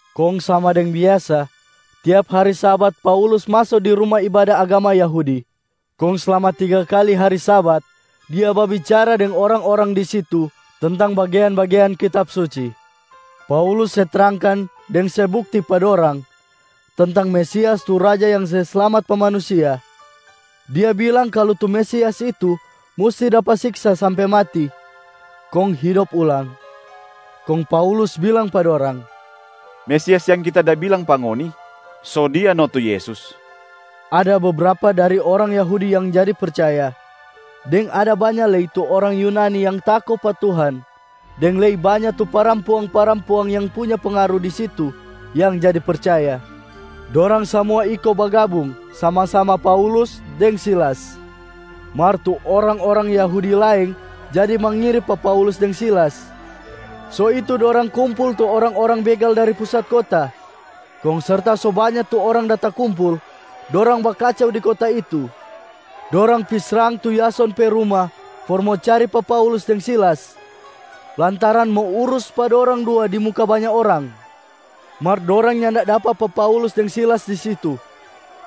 Kong sama deng biasa, tiap hari Sabat Paulus maso di ruma ibada agama Yahudi, kong slama tiga kali hari Sabat dia babicara deng orang-orang di situ tentang bagean-bagean Kitab Suci. Paulus se trangkan deng se bukti pa dorang tentang Mesias tu Raja yang se slamat pa manusia. Dia bilang kalu tu Mesias itu musti dapa siksa sampe mati kong hidop ulang. Kong Paulus bilang pa dorang, “Mesias yang kita da bilang pa ngoni, so Dia no tu Yesus.” Ada bebrapa dari orang Yahudi yang jadi percaya, deng ada banya lei tu orang Yunani yang tako pa Tuhan deng lei banya tu parampuang-parampuang yang punya pengaru di situ yang jadi percaya. Dorang samua iko bagabung sama-sama Paulus deng Silas. Mar tu orang-orang Yahudi laeng jadi mangiri pa Paulus deng Silas. So itu dorang kumpul tu orang-orang begal dari pusat kota, kong serta so banya tu orang da takumpul, dorang bakacau di kota itu. Dorang pi srang tu Yason pe ruma for mo cari pa Paulus deng Silas, lantaran mo urus pa dorang dua di muka banya orang. Mar dorang nyanda dapa pa Paulus deng Silas di situ,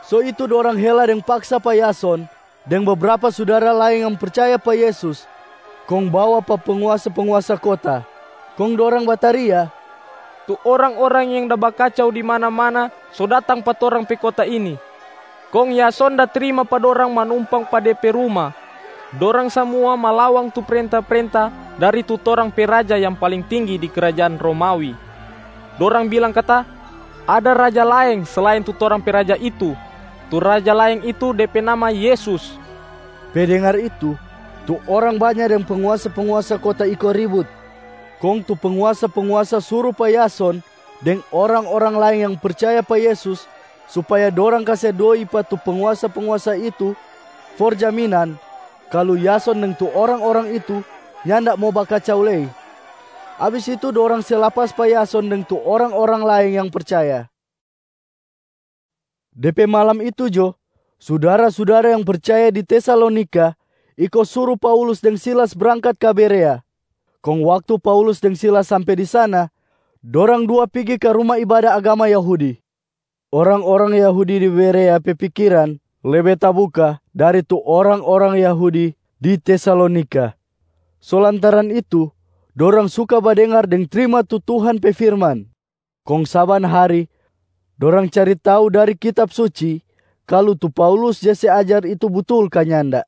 so itu dorang hela deng paksa pa Yason deng bebrapa sudara laeng yang percaya pa Yesus kong bawa pa penguasa-penguasa kota. Kong dorang bataria, “Tu orang-orang yang da bakacau di mana-mana so datang pa torang pe kota ini. Kong Yason da trima pa dorang manumpang pa de pe ruma. Dorang samua malawang tu prenta-prenta dari tu torang pe raja yang paling tinggi di krajaan Romawi. Dorang bilang kata ada raja laeng selain tu torang pe raja itu. Tu raja laeng itu, de pe nama Yesus.” Pe dengar itu, tu orang banya deng penguasa-penguasa kota iko ribut. Kong tu penguasa-penguasa suru pa Yason deng orang-orang laeng yang percaya pa Yesus supaya dorang kase doi pa tu penguasa-penguasa itu for jaminan kalu Yason deng tu orang-orang itu nyanda mo bakacau lei. Abis itu, dorang se lapas pa Yason deng tu orang-orang laeng yang percaya. De pe malam itu jo, sudara-sudara yang percaya di Tesalonika iko suru Paulus deng Silas brangkat ka Berea. Kong waktu Paulus deng Silas sampe di sana, dorang dua pigi ka ruma ibada agama Yahudi. Orang-orang Yahudi di Berea pe pikiran lebe tabuka dari tu orang-orang Yahudi di Tesalonika. So lantaran itu dorang suka badengar deng trima tu Tuhan pe firman. Kong saban hari dorang cari tau dari Kitab Suci kalu tu Paulus ja se ajar itu butul ka nyanda.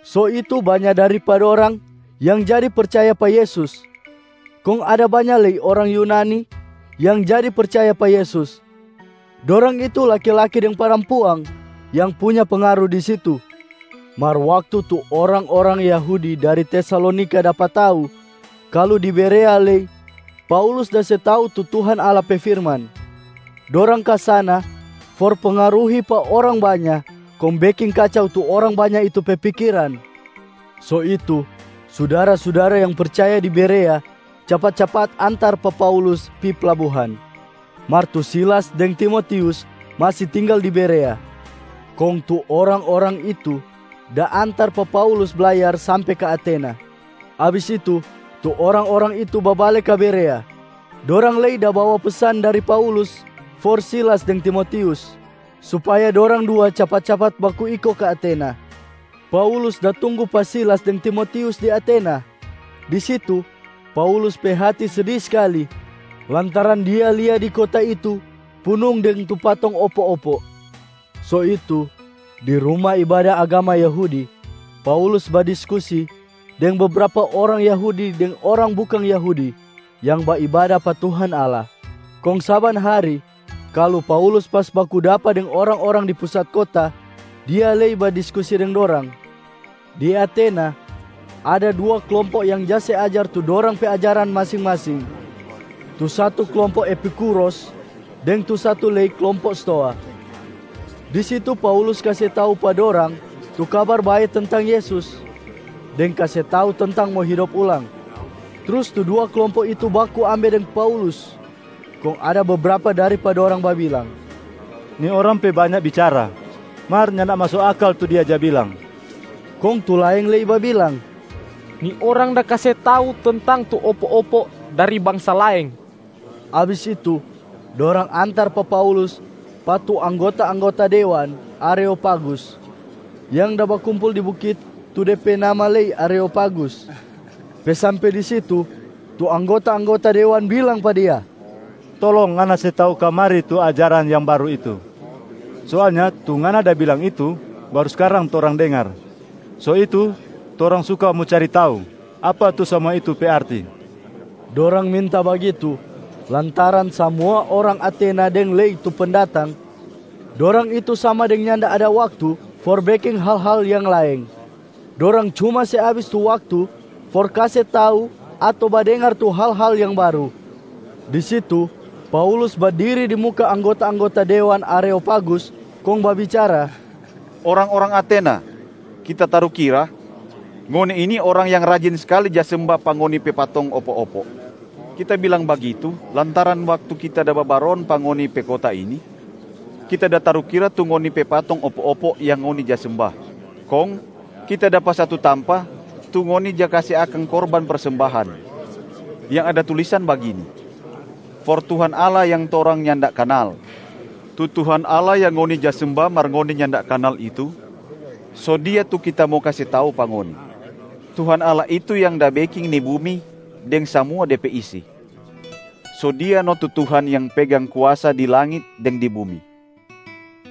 So itu banya dari pa dorang yang jadi percaya pa Yesus. Kong ada banya lei orang Yunani yang jadi percaya pa Yesus, dorang itu laki-laki deng parampuang yang punya pengaru di situ. Mar waktu tu orang-orang Yahudi dari Tesalonika dapa tau kalu di Berea lei Paulus da se tau tu Tuhan Allah pe firman, dorang ka sana for pengaruhi pa orang banya kong beking kacau tu orang banya itu pe pikiran. So itu, sudara-sudara yang percaya di Berea capat-capat antar pa Paulus pi plabuhan, mar tu Silas deng Timotius masi tinggal di Berea. Kong tu orang-orang itu da antar pa Paulus blayar sampe ka Atena. Abis itu, tu orang-orang itu babale ka Berea. Dorang lei da bawa pesan dari Paulus for Silas deng Timotius, supaya dorang dua capat-capat baku iko ka Atena. Paulus da tunggu pa Silas deng Timotius di Atena. Di situ, Paulus pe hati sedi skali lantaran dia lia di kota itu punung deng tu patong opo-opo. So itu di ruma ibada agama Yahudi, Paulus badiskusi deng bebrapa orang Yahudi deng orang bukang Yahudi yang baibada pa Tuhan Allah. Kong saban hari, kalu Paulus pas baku dapa deng orang-orang di pusat kota, dia lei badiskusi deng dorang. Di Atena ada dua klompo yang ja se ajar tu dorang pe ajarana masing-masing. Tu satu klompo Epikuros deng tu satu lei klompo Stoa. Di situ Paulus kase tau pa dorang tu Kabar Bae tentang Yesus, deng kase tau tentang mo hidop ulang. Trus tu dua klompo itu baku ambe deng Paulus, kong ada bebrapa dari pa dorang babilang, “Ni orang pe banya bicara, mar nyanda maso akal tu dia ja bilang.” Kong tu laeng lei babilang, “Ni orang da kase tau tentang tu opo-opo dari bangsa laeng.” Abis itu dorang antar pa Paulus pa tu anggota-anggota dewan Areopagusb yang da bakumpul di bukit tu de pe nama lei Areopagus. Pe sampe di situ, tu anggota-anggota dewan bilang pa dia, “Tolong ngana se tau kamari tu ajaran yang baru itu! Soalnya tu ngana da bilang itu baru skarang torang dengar. So itu torang suka mo cari tau apa tu samua itu pe arti.” Dorang minta bagitu, lantaran samua orang Atena deng lei tu pendatang, dorang itu sama deng nyanda ada waktu for beking hal-hal yang laeng, dorang cuma se abis tu waktu for kase tau ato badengar tu hal-hal yang baru. Di situ Paulus badiri di muka anggota-anggota dewan Areopagus, kong babicara, “Orang-orang Atena! Kita tarukira, ngoni ini orang yang rajin skali ja semba pa ngoni pe patong opo-opo. Kita bilang bagitu lantaran waktu kita da babaron pa ngoni pe kota ini, kita da tarukira tu ngoni pe patong opo-opo yang ngoni ja semba. Kong kita dapa satu tampa tu ngoni ja kase akang korban persembahan, yang ada tulisan bagini, ‘For Tuhan Allah yang torang nyanda kanal.’ Tu Tuhan Allah yang ngoni ja semba mar ngoni nyanda kanal itu, so Dia tu kita mo kase tau pa ngoni. Tuhan Allah itu yang da beking ni bumi deng samua de pe isi. So Dia no tu Tuhan yang pegang kuasa di langit deng di bumi.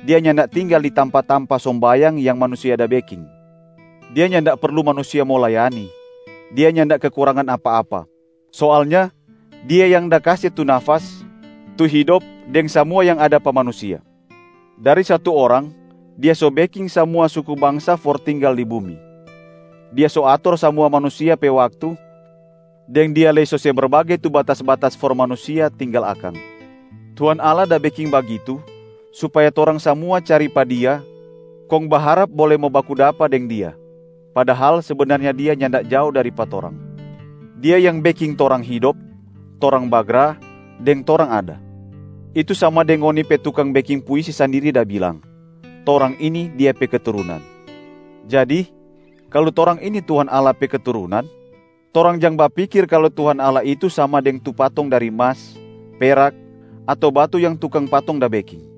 Dia nyanda tinggal di tampa-tampa sombayang yang manusia da beking. Dia nyanda perlu manusia mo layani, Dia nyanda kekurangan apa-apa. Soalnya Dia yang da kase tu nafas, tu hidop deng samua yang ada pa manusia. Dari satu orang Dia so beking samua suku bangsa for tinggal di bumi. Dia so ator samua manusia pe waktu deng Dia lei so se berbage tu batas-batas for manusia tinggal akang. Tuhan Allah da beking bagitu supaya torang samua cari pa Dia kong baharap bole mo baku dapa deng Dia, padahal sebenarnya Dia nyanda jao dari pa torang. Dia yang beking torang hidop, torang bagra deng torang ada. Itu sama deng ngoni pe tukang beking puisi sandiri da bilang, ‘Torang ini, Dia pe keturunan.’ Jadi kalu torang ini Tuhan Allah pe keturunan, torang jang bapikir kalu Tuhan Allah itu sama deng tu patong dari mas, perak ato batu yang tukang patong da beking.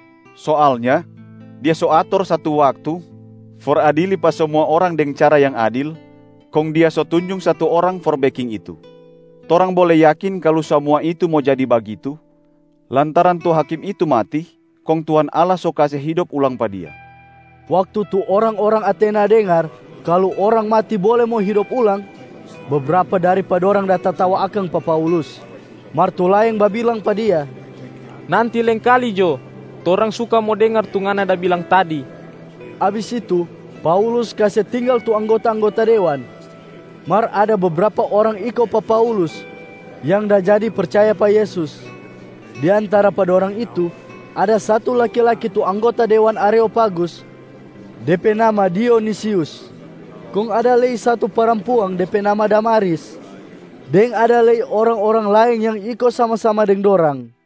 Soalnya, Dia so ator satu waktu for adili pa samua orang deng cara yang adil, kong Dia so tunjung satu Orang for beking itu. Torang bole yakin kalu samua itu mo jadi bagitu, lantaran tu Hakim itu mati kong Tuhan Allah so kase hidop ulang pa Dia.” Waktu tu orang-orang Atena dengar kalu orang mati bole mo hidop ulang, bebrapa dari pa dorang da tatawa akang pa Paulus. Mar tu laeng babilang pa dia, “Nanti laengkali jo torang suka mo dengar tu ngana da bilang tadi.” Abis itu, Paulus kase tinggal tu anggota-anggota dewan. Mar ada bebrapa orang iko pa Paulus yang da jadi percaya pa Yesus. Di antara pa dorang itu, ada satu laki-laki tu anggota dewan Areopagus, de pe nama Dionisius. Kong ada lei satu parampuang de pe nama Damaris, deng ada lei orang-orang laeng yang iko sama-sama deng dorang.